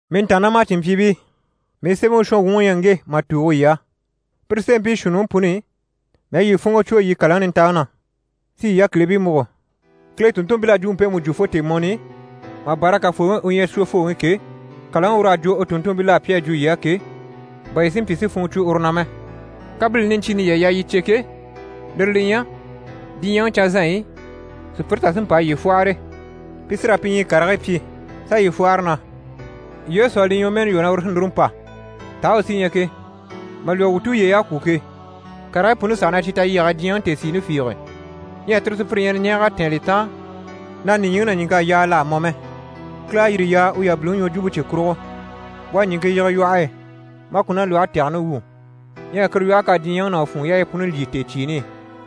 Mii ntàannamacinmpyiibii, mii sémɛŋi shɔnwuŋi u ɲyɛ ŋge mà tùugo yii á. Pire sémɛbii shuunniŋi puni i, mii à yii funŋɔ cwo yii kàlaŋi nintaŋi na, si yii yákilibii múgo, Kile tùnntunmpil'à jwumpe mpemu jwo fo tèemɔni i, mà bâra Kafooŋi u ɲyɛ Shwofooŋi ke, kàlaŋi ur'à jwo u tùnntumpil'á, pi à jwo yii á ke, bà yii si mpyi si funŋɔ cwo uru na mɛ. Kabilini niɲcyiini yii à yaa yii cè ke, lire li ɲyɛ: diɲyɛŋi canzanɲyi i, sùpyire tà sí n‑pa a yii fwɔ́hɔre. Pi sí raa pi ɲyii karigii pyi, s'a yii fwɔ́hɔre na: «Yesu à li ɲwɔmɛɛni lwɔ́ na uru sí núru n‑pa, taa u sí ɲyɛ ke? Mà lwɔ́ wuu tulyey'à kwû ke, karigii puni saha ɲyɛ cyi talyɛge e diɲyɛŋi tèesiini fiige.» Ɲyɛ tire sùpyire ɲyɛ na ɲɛɛg'a tɛ̀ɛn li taan, na nìɲyiŋi ná ɲìŋk'à yaa l'à mɔ mɛ. Kile à yire yaa u yabiliŋi ɲwɔjwumpe cye kurugo. U à ɲìŋke yige lwɔhe e, maa ku ná lwɔhe tɛgɛni wwû. Ɲyɛ kuru lwɔhe k'à diɲyɛŋi ná u funŋɔ yaayi puni lyî tèecyiini i.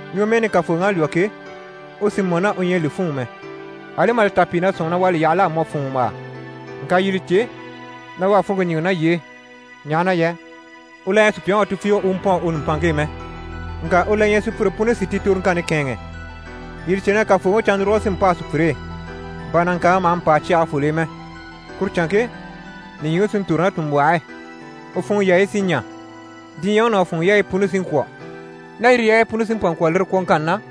Ɲwɔmɛɛni Kafooŋi à lwɔ́ ke, u sì mɔ ná u ɲyɛ a li fûnŋɔ mɛ, ali mà li ta pìi na sɔ̂nŋi na u à li yaha l'à mɔ fùnŋɔmbaa. Ŋka yii li cè na u à funŋke ɲíŋɛ ná yii e, ɲaha na yɛ u la ɲyɛ sùpyaŋi wà tufiige u pɔ̂ɔn u nùmpanŋke e mɛ, ŋka u la ɲyɛ sùpyire puni si ti toroŋkanni kɛ̂ɛnŋɛ. Yii li cè na Kafooŋi cannuruge sí n‑pâa sùpyire e, bà nàŋkaaŋi maha mpâa cyagefol'e mɛ. Kuru canŋke, nìɲyiŋi sí n‑tòro ná tùnmbwɔh'e, u funŋɔ yaayi sí ɲa, diɲyɛŋi ná u funŋɔ yaayi puni sí n‑kwɔ̀. Ná yire yaayi puni sí n‑pa n‑kwɔ̀ lire kwɔ̀ŋkanni na,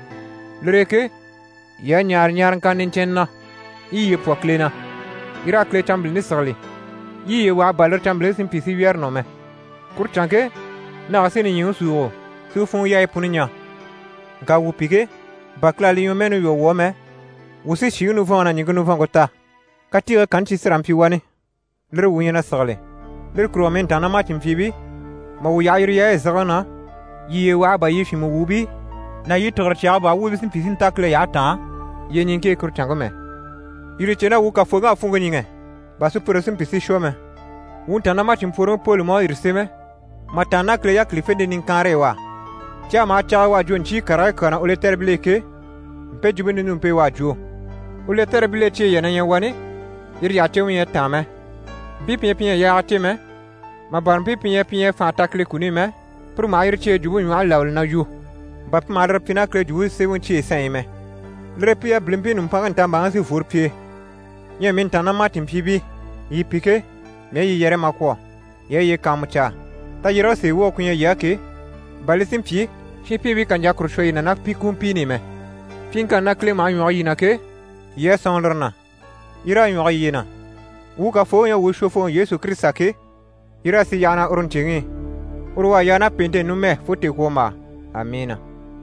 lire e ke, yii a ɲaare ɲaaraŋkanna niɲcɛnnɛ na, yii i yiye pwɔ Kile na, yii raa Kile canmbilini sigili, yii yiye waha bà lire canmbilini si mpyi si wyɛ̀rɛ nɔ mɛ. Kuru canŋke nage sí nìɲyiŋi súugo, si u funŋɔ yaayi puni ɲa. Ŋka wuu pi ke, bà Kile à li ɲwɔmɛɛni lwɔ́ wuu á mɛ, wuu sí nìɲyiŋi nivɔnŋi ná ɲìŋke nivɔnŋke ta, katiigii kanni cyi sí raa n‑pyi wani, lire wuu ɲyɛ na sigili. Lire kurugo mii ntàannamacinmpyiibii, mà wuu yaha yire yaayi zigiŋi na, yii yiye waha bà yii fyìnmɛ wuubii ná yii tìgire cyaga baa wuubii si mpyi si nta Kile yyahe taan yyeɲiŋke e kuru canŋke mɛ. Yii li cè na wuu Kafooŋi à funŋke ɲíŋɛ, bà sùpyire si mpyi si shwɔ mɛ. Wuu ntàannamacinmpworoŋi Poli mú à yire sémɛ mà tàanna ná Kile yákilifente niŋkaanre u á. Cyaga maha cyag'e u à jwo ɲcyii karigii kyaa na u lɛtɛribil'e ke, mpe jwumpe ninumpe u à jwo. U lɛtɛribil'e cyeyi yà na ɲyɛ wani, yire yyahacemɛ ɲyɛ a táan mɛ. Mpii pi ɲyɛ pi ɲyɛ a yaaga cè mɛ, mà bâra mpii pi ɲyɛ pi ɲyɛ a fànha ta Kile kuni i mɛ, pire maha yire cyeyi jwumpe ɲwɔhe labali na yu, bà pi maha lire pyi ná Kile Jwumpe Semɛŋi cyeyi sanɲyi i mɛ. Lire e pi yabilimpii nùmpanŋke ntambaaŋi sí n‑fworo pi e. Ɲyɛ mii ntàannamacinmpyiibii, yii pi ke, mii à yii yɛrɛ mà kwɔ̀, yii a yiye kàanmucaa, tayyérege sèe woge ku ɲyɛ yii á ke, bà li si mpyi shinpiibii kà ɲjà kuru shwɔ yii na ná pi kumpiini i mɛ. Pyiŋkanni na Kile maha ɲwɔge yii na ke, yii a sɔ̂nŋi lire na, yii raa ɲwɔge yiye na. Wuu Kafooŋi u ɲyɛ wuu Shwofooŋi Yesu Kirisita ke, yii raa sì yyaha na uru ɲcèŋi i. Uru u à yaa ná pèente e, numɛ fo tèekwombaa. Amiina!